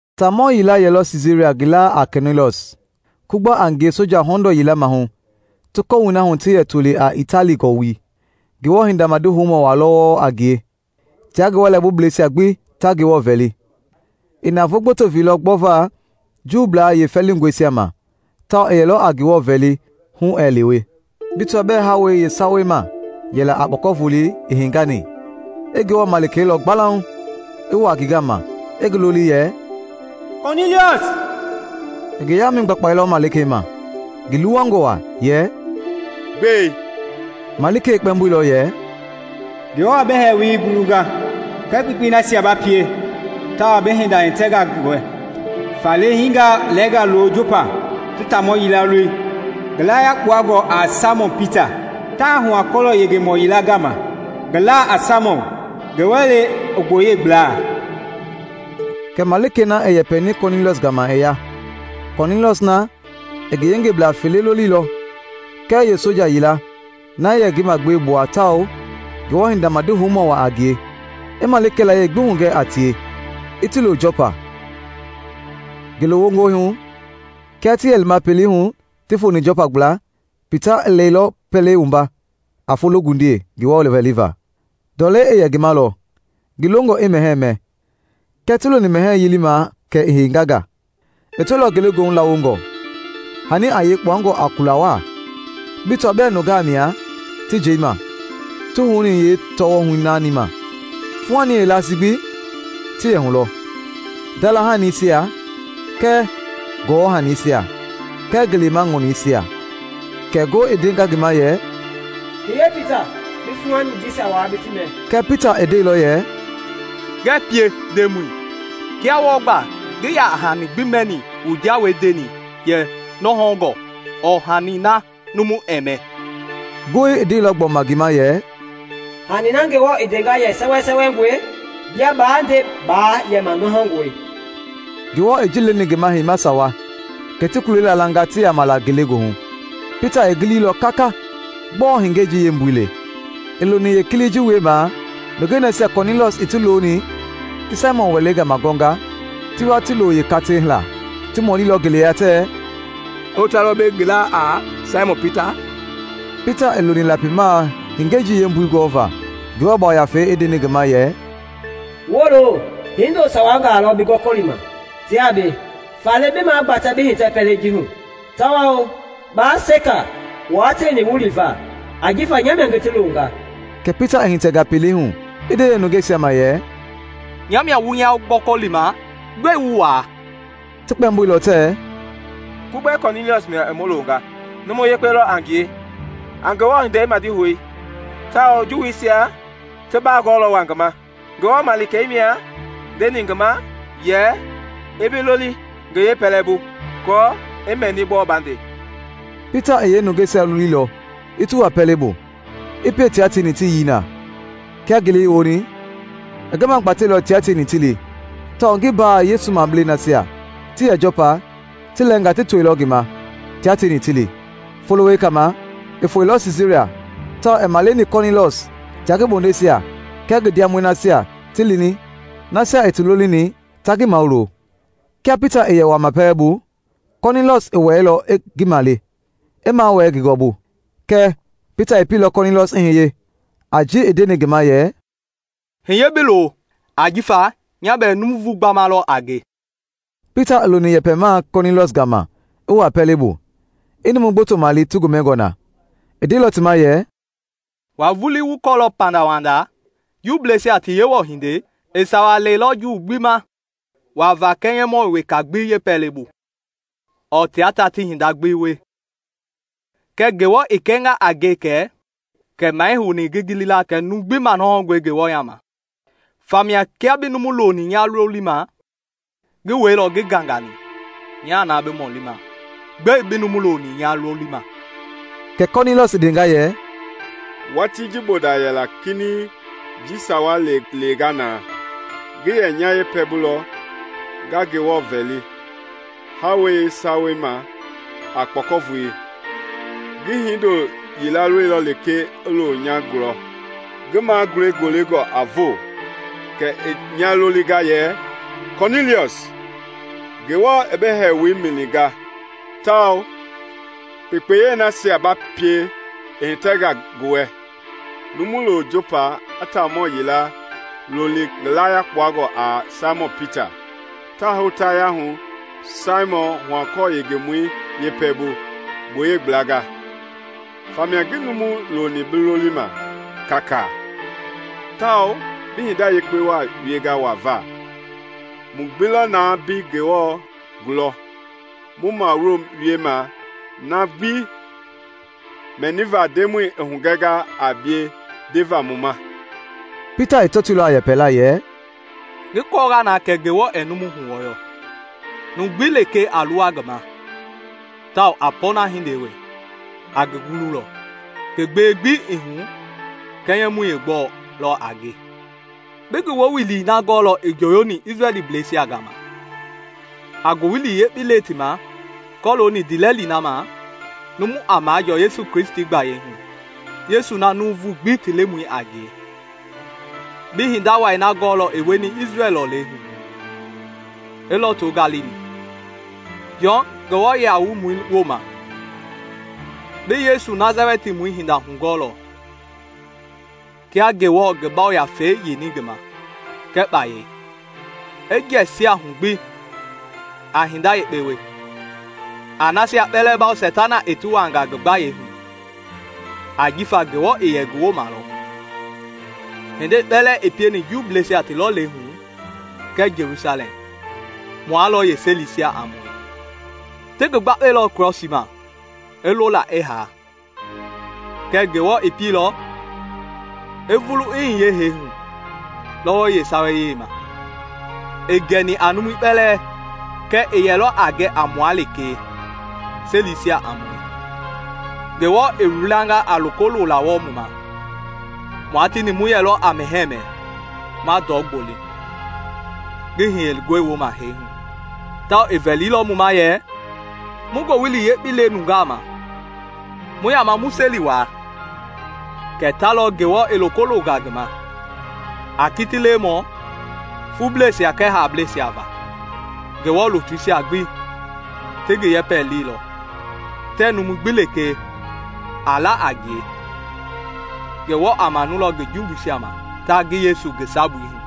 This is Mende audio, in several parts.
Taamɔ yila yɛlɔ Siisaria ngi laa a Kɔniiliɔs, Kugba a ngie soja hɔndɔɔ yila maahu ti kɔwui na hu ti yɛ toli a “Itali Gɔ-wui.” Ngewɔ hinda madi houmɔ waa lɔ wɔɔ a ngie, tia ngi wɛlɛbubleisia gbi ta Ngewɔ vɛli. I navoo gboto veilɔ gbɔva Juu yeefɛlingɔisia ma tawao i yɛlɔ a Ngewɔ vɛli hu ɛɛ lewe. Bi tɔaa bɛɛ hawei yeesawei ma yɛla a kpɔkɔvolei i hengani, i Ngewɔ malikei lɔ gbalauŋ i wuaa ngi gama i ngi loli yɛ, “Kɔniiliɔs!” I ngi yaamɛi gbakpailɔ malikei ma, ngi luwangɔ waa, yɛ, “Gbɛe?” Malikei i kpɛmboilɔ yɛ, “Ngewɔ i bi hɛɛwoi gulunga kɛɛ kpekpei nasia ba pie, tawao bi hinda i hitɛnga ngi wɛ. Faale hiingaa lɛɛngaa lo Jɔpa ti taamɔ yila loli, ngi laa yakpangɔi a Saimɔn Pita. Taa hua-kɔlɔ yengemɔ yila gama ngi laa a Saimɔn, ngi wɛlei i gboyei gbla.” Kɛ malikei na i yɛpɛni Kɔniiliɔs gama i ya. Kɔniiliɔs na i ngi yeengengeblaa fele loliilɔ kɛɛ yeesoja yila na yɛ ngi magbewe gbua tawao, Ngewɔ hinda madihoumɔ waa a ngie, i malikei layie gbi hugɛ a tie, i ti lo Jɔpa. Ngele wongɔi hu, kia ti yɛ lima pelei hu ti foni Jɔpa gbla, Pita i lɛilɔ pɛlei wumba a fologundiei Ngewɔ vɛliva. Ndɔlei i yɛ ngi ma lɔ, ngi longɔ i mɛhɛɛ mɛ; kɛ ti loni mɛhɛɛ yilimaa kɛ i henganga. I tɔilɔ ngelegoohu lawongɔ, hani a yei kpuangɔ a kula waa, bi tɔaa bɛɛ nungaa mia ti njeima ti houni yeetɔɔhu naani ma. Fuuhani yeelasii gbi ti yɛ hu lɔ: ndalahanisia kɛɛ gɔwɔnaanisia kɛɛ ngelema ŋɔningɛisia. Kɛ ngoo i ndenga ngi ma yɛ, “Hiye Pita, bi fuuhani jisia waa bi ti mɛ.” Kɛɛ Pita i ndeilɔ yɛ, “Ngɛɛ pie, Ndemɔi! Kia wɔɔ gba ngii yaa hani gbi mɛni mu jawei ndeni yɛ nɔhɔngɔi ɔɔ hani na numu ɛɛ mɛ.” Ngoi i ndeilɔ gbɔma ngi ma yɛ, “Hani na Ngewɔ i ndenga yɛ sɛwɛsɛwɛngɔe, bia baa nde baa yɛma nɔhɔngɔe.” Ngewɔ i ji leni ngi ma heima sawa; kɛ ti kulei laalanga ti yaama la ngelegoohu. Pita i giliilɔ kaka gbɔɔ hengei ji yeembui le. I loni yeekilii ji wiemaa nungei nasia Kɔniiliɔs i ti loni ti Saimɔn wɛlei gama gɔɔnga, ti wa ti lo yeekatei laa. Ti mɔlilɔ ngeleya tɛɛ, “Hota lɔ mbei ngi laa a Saimɔn Pita?” Pita i loni lapimaa hengei ji yembui gɔvaa Ngewɔ Yafei i ndeni ngi ma yɛ, “Wolo! Hindo sawa ti bi gɔkɔlima tiaa mbei. Faale bi magbatɛ bi hitɛ pɛlei ji hu tawao baa seka wua tieni wu liva ajifa nya mia ngi ti longa.” Kɛ Pita i hitɛnga pɛlei hu i nde yeenungeisia ma yɛ, “Nya mia wu nya gɔkɔlima. Gbɛe wu waa?” Ti kpɛmboilɔ tɛɛ, “Kugbei Kɔniiliɔs mia i mu longa. Numu yekpe lɔ a ngie, a Ngewɔ hindei madihou tawao Juuisia ti baa gɔɔlɔ waa ngi ma. Ngewɔ malikei mia ndeni ngi ma yɛ i bi loli ngi yeepɛlɛbu, aako i mɛni gbɔɔ ba nde.” Pita i yeenungeisia loliilɔ ti wua pɛlei bu, i pie tia tieni ti yii na. Kia ngele i woni, i ngi magbateilɔ tia tieni ti li, tawao ngi mbaa Yesu mableisia nasia ti yɛ Jɔpa ti lɛɛngaa ti toilɔ ngi ma tia tieni ti li. Folo wekei ma i foeilɔ Siisaria tawao i maleni Kɔniiliɔs tia ngi bondeisia kɛɛ ngi ndiamɔi nasia i ti lolini ta ngi mawulo. Kia Pita i yɛ wuaama pɛlei bu, Kɔniiliɔs i wɛilɔ i ngi male, i mawɛɛ ngi gɔɔbu. Kɛɛ Pita i pieilɔ Kɔniiliɔs i hiye, a ji i ndeni ngi ma yɛ, “Hiye bi lo ajifa nya bɛɛ nuuvu gbama lɔ a nge.” Pita i loni yɛpɛmaa Kɔniiliɔs gama i wuaa pɛlei bu, i numu gboto male ti gomɛngɔ na. I ndeilɔ ti ma yɛ, “Wua vulii wu kɔɔlɔ pandawanda Juuisia ti Yewɔ hindei i sawa lɛilɔ Juu gbi ma wuava kɛnyɛmɔ weka gbi yeepɛlɛbu ɔɔ tia ta ti hinda gbi wie. Kɛɛ Ngewɔ i kɛnga a nge kɛ maa ii houni ngi gili la kɛ numu gbi manɔhɔngɔe Ngewɔ yaama. Famia kia bi numu loni nya lolima, ngi wɛilɔ ngii gangani. Nya na bi mɔlima, gbɛe bi numu loni nya lolima?” Kɛ Kɔniiliɔs i ndenga yɛ, “Watii ji bonda yɛla kinɛiŋ, njii sawa i lewenga na, ngi yɛ nya yeepɛlɛbu lɔ nga Ngewɔ vɛli hawei yeesawei ma a kpɔkɔvolei. Ngi hindo yila lɔilɔ lekee i looni nya gulɔ, ngi magulɛi golengɔ, a voo. Kɛ i nya lolinga yɛ, ‘Kɔniiliɔs! Ngewɔ i bi hɛɛwoi mɛninga tawao kpekpeyei nasia ba pie i hitɛnga ngi wɛ. Numu lo Jɔpa i taamɔ yila loli ngi laa yakpangɔi a Saimɔn Pita. Taa hotaya hu Saimɔn huakɔɔ yengemɔi yeepɛlɛbu gboyei gblanga.’ Famia ngi numu loni bi lolima kaakaa, tawao bi hinda yekpe waa wienga wava. Mu gbi lɔ na mbei Ngewɔ gulɔ mu mawuloma na gbi mɛniva Ndemɔi i hugɛnga a bie ndeva mu ma.” Pita i tɔtoilɔ a yɛpɛla yɛ, “Ngi kɔɔnga na kɛ Ngewɔ ɛɛ numu huwɔyɔ. Numu gbi lekee a luwa ngi ma tawao a pɔɔna hindei wie, a ngi gululɔ, ngi gbewe gbi ii hu kɛnyɛ mɔi yeegbɛ lɔ a ngie. Bi ngi woowili na gɔɔlɔ i njoyoni Isrɛlbleisia gama, a Ngowili Yekpei le ti ma kɔlooni ndiilɛli na ma numu a majɔɔ Yesu Kristi gbayei hu, Yesu na nuuvu gbi ti Lemɔi a ngie. Bi hinda wai na gɔɔlɔ i wieni Isrɛl lɔlei hu gbi, i lɔto Galili, Jɔn numu wualei wooma. Bi Yesu Nasalɛtimɔi hinda hugɔɔlɔ, kia Ngewɔ i ngi Yafei yeini ngi ma kɛɛ kpayei. I jɛsiɛlɔ hu gbi, a hinda yekpe wie, a nasia kpɛlɛɛ bawo Seitana i ti wuaanga ngi gbayei hu, ajifa Ngewɔ i yɛ ngi wooma lɔ. Hindei kpɛlɛɛ i pieni Juuisia ti lɔlei hu kɛɛ Jelusalɛm, mua lɔ yeeselisia a mue. Ti ngi gbakpailɔ Krɔsii ma i lo na i haa. Kɛɛ Ngewɔ pieilɔ i vulu i hiye hee hu lɔwɔi yeesawei ma, ii gɛni a numu kpɛlɛɛ kɛɛ i yɛlɔ a gɛ a mua lekee selisia a mue Ngewɔ i wilanga a loko lola wɔɔ mu ma. Mua tieni mu yɛlɔ a mɛhɛɛ mɛ, ma ndɔ gboli ngi hiyengɔi wooma hee hu. Tawao i vɛlilɔ mu ma yɛ mu Ngowili Yekpei le nungaa ma, mu yaama mu seli wuaa kɛ ta lɔ Ngewɔ i loko longa ngi ma a kiti-lewemɔ fubleisia kɛɛ haableisia va. Ngewɔ lutuisia gbi ti ngi yɛpɛ leilɔ tɛɛ numu gbi lekee a la a ngie Ngewɔ a manulɔ ngi jumbuisia ma ta ngi Yesu ngi sabui hu.”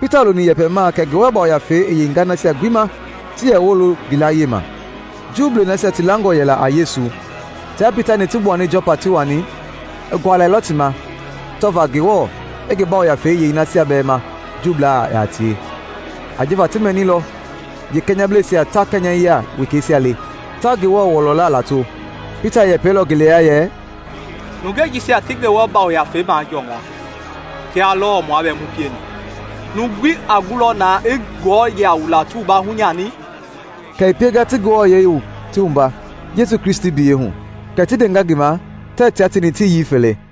Pita loni yɛpɛmaa kɛ Ngewɔ Yafei i yeinga nasia gbi ma ti yɛ wolo ngi layie ma. Juu nasia ti langɔ yɛla a Yesu, tia Pita-ni ti gbuani Jɔpa ti wani, i gualɛilɔ ti ma tɔva Ngewɔ i ngi Yafei yei nasia bɛɛ ma Juublaa yaa tie. Ajifa ti mɛnilɔ yeekɛnyɛblɛisia ta kɛnyɛyia wekeisia le, ta Ngewɔ wɔlɔla lato. Pita i yɛpɛilɔ ngeleya yɛ, “Nungei jisia ti Ngewɔ Yafei majɔnga, kia lɔɔ mua bɛɛ mu pieni. Numu gbi a gulɔ na i ti wualaa hunyani?” Kɛ i pienga ti ti wua Yesu Kristi biyɛi hu. Kɛ ti ndenga ngi ma tɛɛ tia tieni ti yii fele.